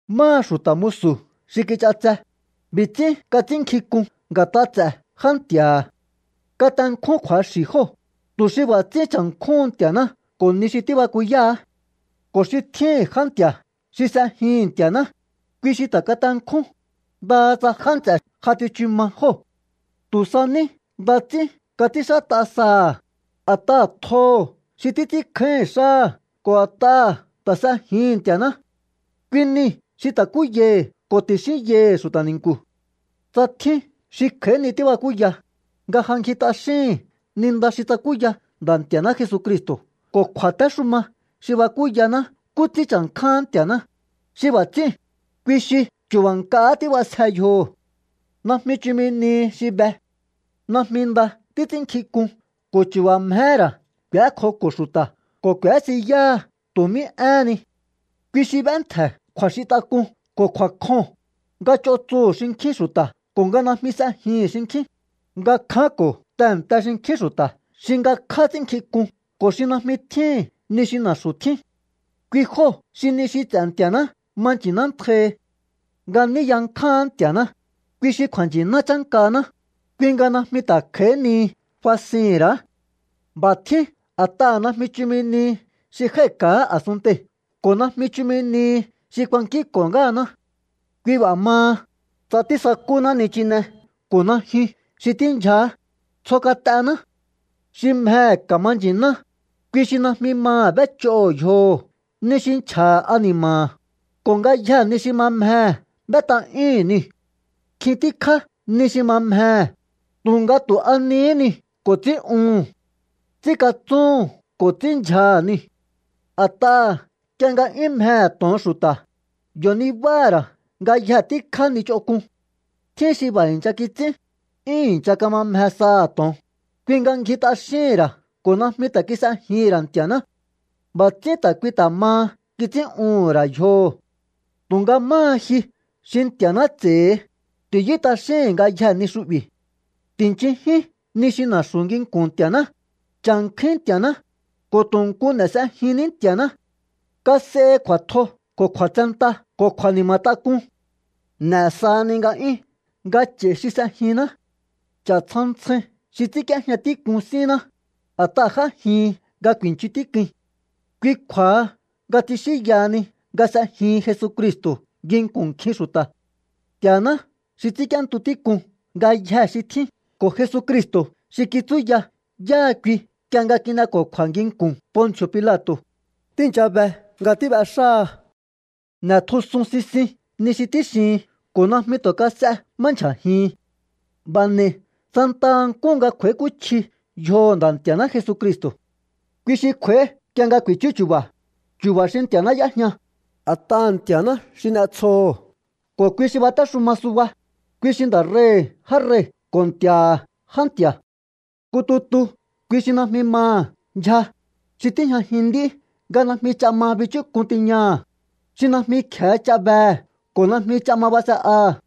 Máha xu̱ta̱ musu̱ xi kich'atse, b'i̱ ts'ín kats'ínnkjink'un nga̱t'a ts'e̱ jántji̱a̱ha̱. Katenkjún kju̱axi̱ jóo̱, tu̱ xi b'a̱ ts'ín cha̱nkjúhun Nti̱a̱ná ko̱ ni xi tíbakuyáá. Ko̱ xi tjíhi̱n já nti̱a̱ xi s'ejihi̱n Nti̱a̱ná, kui xi ta̱ katenkjún, ndaha tsa já nts'e̱ ja tsichu ma jóo̱. Tu̱ sa ní nda ts'ín kats'ínxát'a saha̱, a̱t'aha̱ tjoho̱ xi títs'ínkjáíhi̱n xáha̱ ko̱ a̱t'aha̱ ta̱ s'ejihi̱n Nti̱a̱ná. Kui nii̱ xi ta̱kúyaihi̱ ko̱ ti̱xínyaihi̱ xu̱ta̱ ni̱nku̱. Tsa tjín xi kj'a̱í ni tíbakúya, nga ja ngji t'axíhi̱n ni nda xi tsakúya Nda̱ Nti̱a̱ná Jesucristo̱ ko̱ kju̱a̱téxuma xi bakúyaná nkú ts'ín cha̱nkjáán Nti̱a̱ná, xi b'a̱ ts'íu̱n, kui xi chu̱ba̱ nk'ahá tíb'asje yjoho̱. Najmi chumi nihi xi be. Najmi nda títs'ínnkjink'un ko̱ chu̱ba̱ mjehé ra̱ k'u̱ékjoko̱ xu̱ta̱ ko̱ k'u̱ésiyáha tu̱ mí éhen ni. Kui xi b'éntje̱ kju̱a̱xintak'uu̱n ko̱ kju̱a̱kjoo̱n, nga ch'on tsuhu̱ xinkjín xu̱ta̱ ko̱ nga najmi s'ejihi̱n xinkjín, nga kjánko̱ tehe̱nte xinkjín xu̱ta̱ xi ngakjá ts'ínnkjink'un ko̱ xi najmi tjíhi̱n ni xi na̱xu̱ tjín. Kui jóo̱ xi ni xi ts'e̱ Nti̱a̱ná ma nchi̱nántjaihi. Nga ní yankjáán Nti̱a̱ná, kui xi kju̱a̱nchi̱ná chánkaná, kui nga najmi ta̱ kj'a̱í nihi fasihi̱n ra̱á. B'a̱ tjín a̱t'aha̱ najmi chumi nihi xi jái̱ka̱á a̱sunntei̱ ko̱ najmi chumi nihi xi kuankínko̱ ngáhaná. Kui b'a̱ maha, tsa tísakúná nichine ko̱ najyun xi tíndyjaá, tsjo kat'ená. Xi mjehe̱ ka̱ma nchi̱ná, kui xi najmi maha̱ b'éch'oho̱ yjoho̱ ni xi nchja̱ha̱ ani̱ma̱ha̱, ko̱ ngayjee̱ ni xi ma mjehe̱ b'ét'a'yúhu̱n niu̱. Nkjin tíkjá ni xi ma mjehe̱, tu̱nga tu̱ a nihí niu̱ ko̱ ts'ín'uhu̱n. Ts'ínkatsúhu̱n ko̱ ts'ínndyjaha̱ niu̱. A̱t'aha̱ nk'ie nga 'yún mjehe̱ to̱on xu̱ta̱, yo̱ nibáha̱ ra̱ ngayje tíkjá ni ch'onk'un. Tjín xi b'a̱ i̱ncha kits'ín, 'yún i̱ncha kama mje saha̱ to̱on, kui nga ngji t'axíhi̱n ra̱ ko̱ najmi ta̱ kis'ejihi̱n ra̱ Nti̱a̱ná. B'a̱ ts'ín ta̱ kui ta̱ maha kits'ín'uhu̱n ra̱ yjoho̱. Tu̱nga máha ji xi Nti̱a̱ná ts'e̱hi, ti̱yú t'axíhi̱n ngayjee̱ ni xu'bi̱. Ti̱nchinjín ni xi na̱xu̱ nginku̱n Nti̱a̱ná, cha̱nkjúín Nti̱a̱ná, ko̱ tu̱ nku n'e̱ s'ejinní Nti̱a̱ná. Kas'ehi kju̱a̱tjo ko̱ kju̱a̱tsenta ko̱ kju̱a̱ni̱ma̱tak'un. N'e̱ sahani nga'yún nga ch'a̱i xi s'ejinná. Ch'a̱ ntsjan ntsjain xi ts'ínk'íéjña tík'un sínná, a̱t'aha̱ j'ájihin nga ku̱i̱nchun tík'uin. Kui kju̱a̱ha nga tsixínyahani nga s'ejihin Jesucristo̱ nginku̱n nkjin xu̱ta̱. Nti̱a̱ná xi ts'ínk'íéntu tík'un ngayjee̱ xi tjín ko̱ Jesucristo̱ xi kitsúya yáha kui nk'ie nga kin'eko̱kju̱a̱ nginku̱n Ponci̱o̱ Pilato̱, tíi̱ncha be nga tíb'exáha. N'e̱tjusun sisin ni xi tíxihin ko̱ najmi tu̱ kas'e má ndyja̱jihin. B'a̱ n'e̱i santaha nkúhu nga kj'u̱a̱íkúchji yjoho̱ Nda̱ Nti̱a̱ná Jesucristo̱. Kui xi kj'u̱a̱í nk'ie nga ku̱i̱chú chu̱ba̱, chu̱ba̱ xi Nti̱a̱ná y'éjña, a̱t'aha̱ Nti̱a̱ná xi n'etsjoho̱ ko̱ kui xi batéxuma suba, kui xi Nda̱ rei̱hi̱ já rei̱ ko̱ Nti̱a̱ha̱ já nti̱a̱. Nku tutu kui xi najmi maha̱ ndyja, xi tíjñajin nd'í nga najmi ch'a ma bichúk'un tiñaha̱, xi najmi kje̱e ch'a behe̱ ko̱ najmi ch'a ma base'aha̱.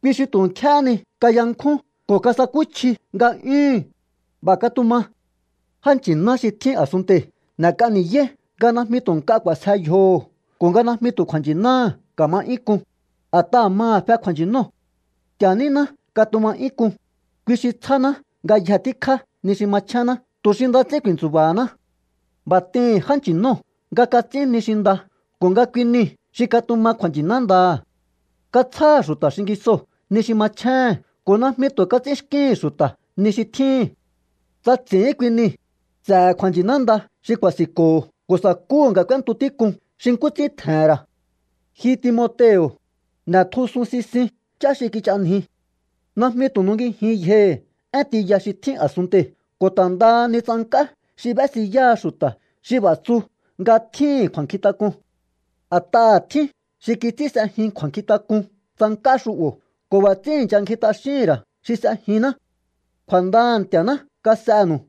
¡Kui xi tu̱ nkjéhé ni kayankjún ko̱ kasakúchji nga'yúhu̱n! B'a̱ katuma. Já nchi̱ná xi tjín a̱sunntei̱ n'e̱k'a ni̱yáí nga najmi tu̱ nk'a k'u̱a̱sje yjoho̱ ko̱ nga najmi tu̱ kju̱a̱nchi̱náha̱ ka̱ma 'yún k'un, a̱t'aha̱ maha̱ fe kju̱a̱nchi̱nóo̱. Nti̱a̱ níná katuma 'yún k'un, kui xi tsjáná ngayje tíkjá ni xi machénná tu̱ xi nda ts'ín ku̱i̱ntsu̱ba̱haná. B'a̱ t'ihi̱n já nchi̱nóo̱ nga kats'ín ni xi nda ko̱ nga kui niu̱ xi katuma kju̱a̱nchi̱ná ndaha̱. Katsjáha̱ xu̱ta̱ xingisoo̱ ni xi machjéhe̱n ko̱ najmi tu̱ kats'ínxkíhi̱n xu̱ta̱ ni xi tjíhi̱n. Tsa ts'i̱ín kui nii̱, s'e̱he̱ kju̱a̱nchi̱ná nda xi ku̱a̱si̱nko̱ho̱ ko̱ sa̱kúhu̱ nga k'úéntu tík'un xi nkú ts'ín tje̱he̱n ra̱. Ji Timoteo̱, n'e̱tjusun sisin ch'á xi kich'anji. Najmi tu̱ nungijin yjohi̱ én tiya xi tjín a̱sunntei̱ ko̱ ta̱ ndaha ni tsank'á xi b'ésiyáha xu̱ta̱ xi b'a̱ tsu nga tjíhi̱n kju̱a̱nkjintak'un. A̱t'aha̱ tjín xi kits'ín s'ejin kju̱a̱nkjintak'un tsank'á xu'bo̱ ko̱ b'a̱ ts'ín i̱ncha ngji t'axíhi̱n ra̱ xi s'ejinná. Kju̱a̱ndaha̱ Nti̱a̱ná kas'enu̱u.